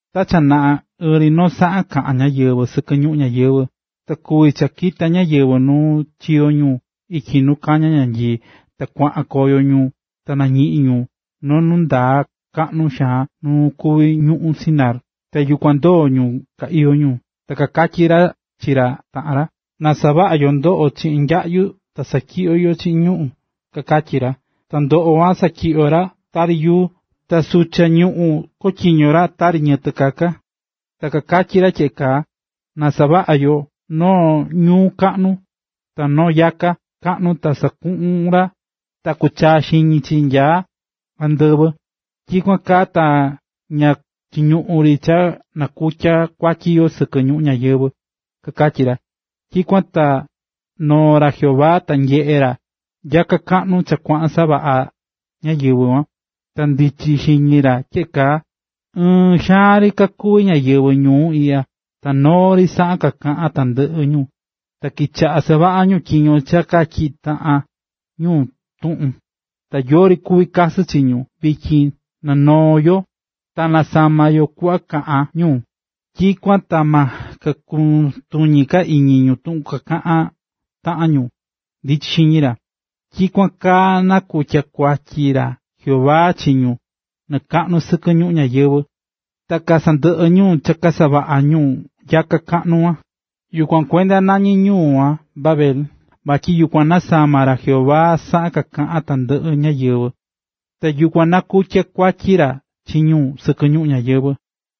Ta cha naꞌa, ɨɨn ri noo saꞌan kaꞌa̱n ñáyɨvɨ sɨkɨ ñuꞌún ñayɨvɨ̱. Ta kuvi̱ cha kita̱ ñáyɨvɨ nu chiyo̱ ñu ityi nu kañá ñanyii, ta kuaꞌan koyo ñu ta nañiꞌi̱n ñu noo nu ndaa kaꞌnu xaan nu kuví ñuꞌún Sinar, ta yukuan ndoo̱ ñu ka iyó ñu. Ta kakatyí ra chi ra taꞌan ra: “Na savaꞌa yo ndoꞌo chiꞌin nyaꞌyu ta satyiꞌyo yo chiꞌin ñuꞌu̱n”, kakatyí ra. Ta ndoꞌo kuan chotyiño̱ ra tari yuu, ta sucha ñuꞌún chotyiño̱ ra tari ñiyɨtɨ kaka. Ta kakatyí ra tyeꞌe kaa: “Na savaꞌa yo noo ñuu kaꞌnu, ta noo nyakaa kaꞌnu ta sukun ta kuchaa xiñi chi nya andɨvɨ. Tyikuan kaa ta ña chiñuꞌun ri cha nakutya kuatyi yo sɨkɨ ñuꞌún ñayɨvɨ̱”, kakatyí ra. Tyikuan ta noo̱ ra Jehová ta nyeꞌe̱ ra nyaka kaꞌnu cha kuaꞌan savaꞌá ñáyɨvɨ kuan. Ta ndichi̱ xiñi ra tyeꞌe kaa: “Ɨɨn xaan ri kakuví ñáyɨvɨ ñuu iꞌya ta noo ri saꞌan kakaꞌán tandɨꞌɨ ñu, ta kichaꞌa̱ savaꞌá ñu tyiño cha katyiꞌi̱ taꞌan ñu tuꞌun, ta yori kuví kakasɨ chi ñu. Vityin na noo yo, ta nasama yo kuꞌva kakaꞌán ñu, tyikuan ta ma kakutuñi ka iñi ñu tuꞌun kakaꞌan taꞌan ñu”, ndichi̱ xiñi ra. Tyikuan kaa nakutya̱ kuatyi ra Jehová chi ñu nɨɨ kaꞌnu sɨkɨ ñuꞌún ñayɨvɨ̱, ta kasandɨꞌɨ̱ ñu cha kasavaꞌá ñu ñuu kaꞌnu kuan. Yukuan kuenda nañí ñuu kuan Babel, vatyi yukuan nasama̱ ra Jehová saꞌan kaꞌán tandɨꞌɨ ñáyɨvɨ, ta yukuan nakutya̱ kuatyi ra chi ñu sɨkɨ ñuꞌún ñayɨvɨ̱.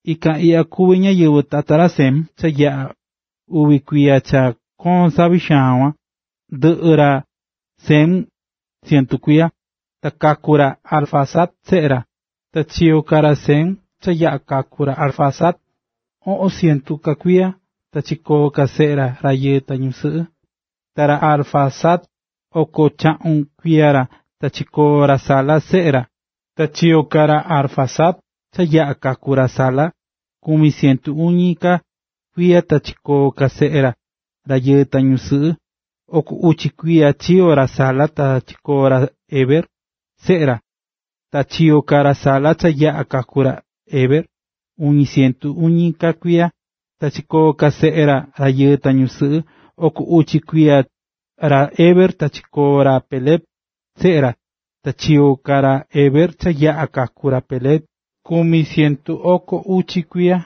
Ikan iꞌya kuví ñáyɨvɨ tata ra Sem. Cha yaꞌa̱ uvi kuiya cha koo̱n savi xaan kuan, ndɨꞌɨ ra Sem cientu kuiya, ta kaku̱ ra Arfaxad seꞌe ra. Ta chiyo̱ ka ra Sem cha yaꞌa̱ kaku̱ ra Arfaxad, oꞌon cientu ka kuiya, ta chikoo̱ ka seꞌe ra, rayɨɨ ta ñusɨꞌɨ. Ta ra Arfaxad oko chaꞌun kuiya ra, ta chikoo̱ ra Sala, seꞌe ra. Ta chiyo̱ ka ra Arfaxad cha yaꞌa̱ kaku̱ ra Sala, kumi cientu uñi ka kuiya, ta chikoo̱ ka seꞌe ra, rayɨɨ ta ñusɨꞌɨ. Oko uchi kuiya ra Sala ta chikoo̱ ra Heberb, seꞌe ra. Ta chiyo̱ ka ra Sala, cha yaꞌa̱ kaku̱ ra Heber, kumi cientu uñi ka kuiya, ta chikoo̱ ka seꞌe ra, rayɨɨ ta ñusɨꞌɨ. Oko uchi kumi kuiya ra Heber, ta chikoo̱ ra Peleg, seꞌe ra. Ta chiyo̱ ka ra Heber, cha yaꞌa̱ kaku̱ ra Peleg, kumi cientu oko uchi kuiya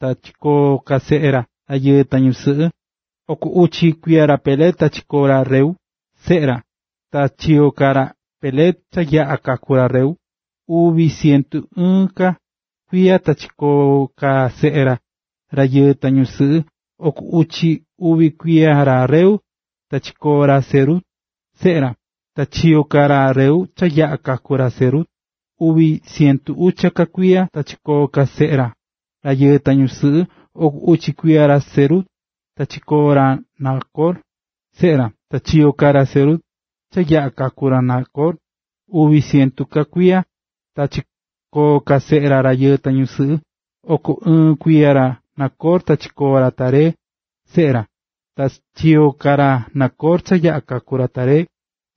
ta chikoo̱ ka seꞌe ra, rayɨɨ ta ñusɨꞌɨ. Oko uchi kuiya ra Peleg ta chikoo̱ ra Reu, seꞌe ra. Ta chiyo̱ ka ra Peleg, cha yaꞌa̱ kaku̱ ra Reu, uvi cientu ɨɨn ka kuiya, ta chikoo̱ ka seꞌe ra, rayɨɨ ta ñusɨꞌɨ. Oko uchi uvi kuiya ra Reu, ta chikoo̱ ra Serug, seꞌe ra. Ta chiyo̱ ka ra Reu, cha yaꞌa̱ kaku̱ ra Serug, uvi cientu ucha ka kuiya ta chikoo̱ ka seꞌe ra, rayɨɨ ta ñusɨꞌɨ. Oko uchi kuiya ra Serug ta chikoo̱ ra Nacor, seꞌe ra. Ta chiyo̱ ka ra Serug, cha yaꞌa̱ kaku̱ ra Nacor, uvi cientu ka kuiya ta chikoo̱ ka seꞌe ra, rayɨɨ ta ñusɨꞌɨ. Oko ɨɨn kuiya ra Nacor ta chikoo̱ ra Taré, seꞌe ra. Ta chiyo̱ ka ra Nacor, cha yaꞌa̱ kaku̱ ra Taré,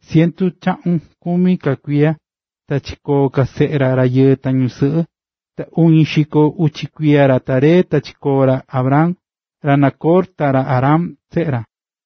cientu chaꞌun kumi ka kuiya ta chikoo̱ ka seꞌe ra, rayɨɨ ta ñusɨꞌɨ. Ta uñi xiko uchi kuiya ra Taré ta chikoo̱ ra Abram, ra Nacor ta ra Harán, seꞌe ra.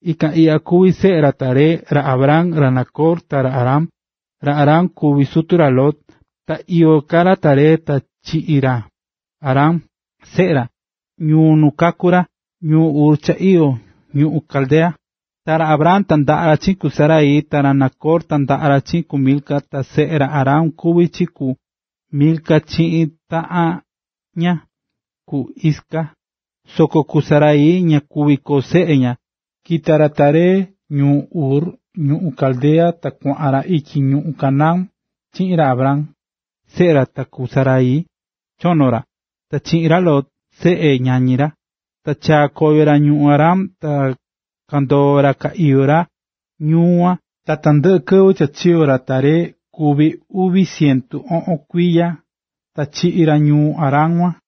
Ikan iꞌya kuví seꞌe ra Taré: ra Abram, ra Nacor, ta ra Harán. Ra Harán kuví sutu ra Lot. Ta iyó ka ra Taré ta chiꞌi̱ ra Harán, seꞌe ra, ñuu nu kaku̱ ra, ñuu Ur cha iyó ñuꞌún Caldea. Ta ra Abram tandaꞌa̱ ra chiꞌin ku Sarai, ta ra Nacor tandaꞌa̱ ra chiꞌin ku Milca, ta seꞌe ra Harán kuví chi ku Milca chiꞌin taꞌan ña, ku Isca. Soko ku Sarai ña kuví koo seꞌe ña. Kita̱ ra Taré ñuu Ur ñuꞌún Caldea ta kuaꞌan ra ityi ñuꞌún Canaán chiꞌin ra Abram, seꞌe ra, ta ku Sarai, chono ra, ta chiꞌin ra Lot, seꞌe ñañi ra. Ta chaa̱ koyo ra ñuu Harán, ta kandoo̱ ra ka iyó ra ñuu yukuan. Ta tandɨꞌɨ kɨvɨ cha chiyo̱ ra Taré kuvi̱ uvi cientu oꞌon kuiya, ta chiꞌi̱ ra ñuu Harán kuan.